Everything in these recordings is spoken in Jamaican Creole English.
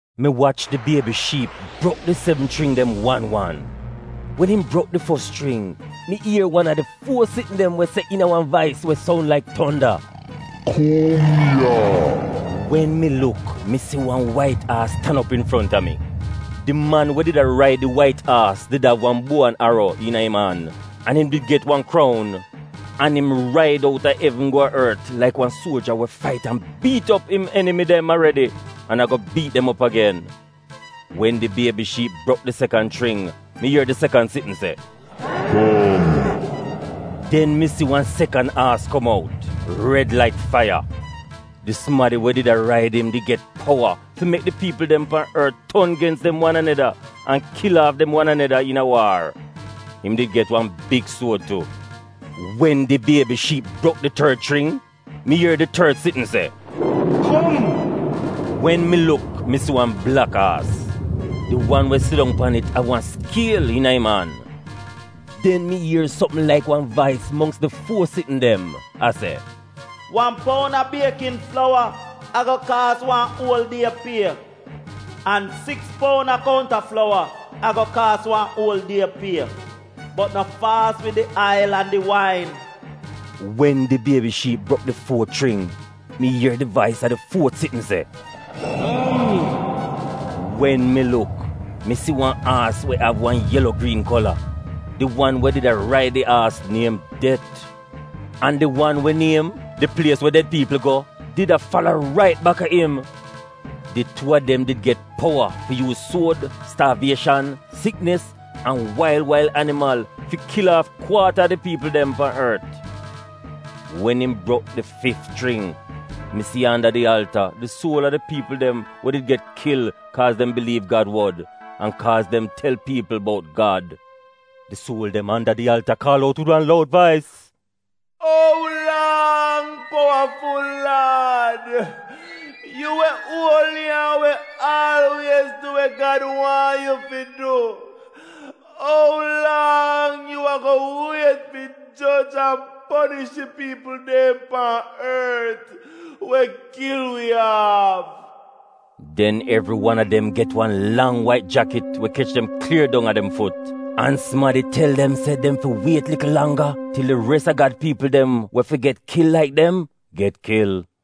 Mi wach di Biebi Shiip brok di sevn chring dem wan bi wan. Wen im brok di fos chring, mi ier wan a di fuo sitn dem se iina wan vais we soun laik tonda, “Kum!” Wen mi luk mi si wan wait aas tan op infronta mi! Di man we did a raid di wait aas did av wan buo an aro iina im an, an im did get wan kroun. An im raid outa evn go a ort laik wan suoja we fait an biit op im enimi dem aredi an a go biit dem op agen. Wen di Biebi Shiip brok di sekan chring, mi ier di sekan sitn se, “Kum!” Den mi si wan sekan aas kom out, red laik faiya. Di sumadi we did a raid im did get powa fi mek di piipl dem pan ort ton gens dem wan aneda an kil aaf dem wan aneda iina waar. Im did get wan big suod tu. Wen di Biebi Shiip brok di tord chring, mi ier di tord sitn se, “Kom!” Wen mi luk mi si wan blak aas! Di wan we sidong pan it av wan skiel iina im an. Den mi ier sopm laik wan vais mongks di fuo sitn dem a se, “Wan poun a biekin flowa ago kaas wan uol die pie, an siks poun a kounta flowa ago kaas wan uol die pie, bot no faas wid di ail an di wain!” Wen di Biebi Shiip brok di fuot chring, mi ier di vais a di fuot sitn se, “Kum!” Wen mi luk, mi si wan aas we av wan yelo-griin kola! Di wan we did a raid di aas niem det, an di wan we niem, di Plies we Ded Piipl Go did a fala rait baka im. Di tuu a dem did get powa fi yuuz suod, staavieshan, siknis, an wail wail animal fi kil aaf kwaata a di piipl dem pan ort. Wen im brok di fif chring, mi si anda di alta di suol a di piipl dem we did get kil kaaz dem biliiv Gad wod an kaaz dem tel piipl bout Gad. Di suol dem anda di alta kaal out wid wan loud vais, “Ou lang, powaful Laad, yu we uoli an we aalwiez du we Gad waahn yu fi du, ou lang yu ago wiet fi joj an ponish di piipl dem pan ort we kil wi aaf? Den evri wan a dem get wan lang wait jakit we kech dem klier dong a dem fut, an sumadi tel dem se dem fi wiet likl langga til di res a Gad piipl dem we fi get kil laik dem, get kil.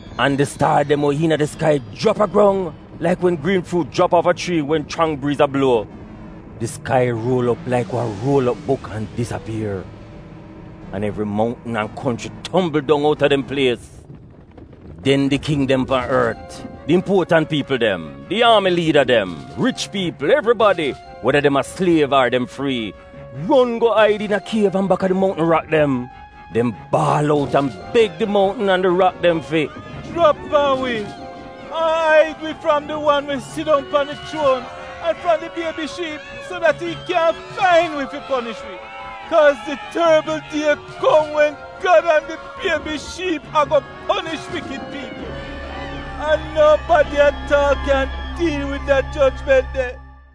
an di staar dem we iina di skai jrap a grong laik wen griin fruut jrap aaf a chrii wen chrang briiz a bluo. Di skai ruol op laik wan ruol op buk an disapier. An evri mountn an konchri tombl dong outa dem plies. Den di king dem pan ort, di impuotant piipl dem, di aami liida dem, rich piipl, evribadi, weda dem a sliev ar dem frii, ron go aid iina kiev an baka di mountn rak dem. Dem baal out an beg di mountn an di rak dem fi: “Jrap pan wi an aid wi fram di wan we sidong pan di chuon, an fram di Biebi Shiip so dat im kyaahn fain wi fi ponish wi. Kaaz di torbl die kom wen Gad an di Biebi Shiip ago ponish wikid piipl, an nobadi at aal kyaahn diil wid da jojment de.”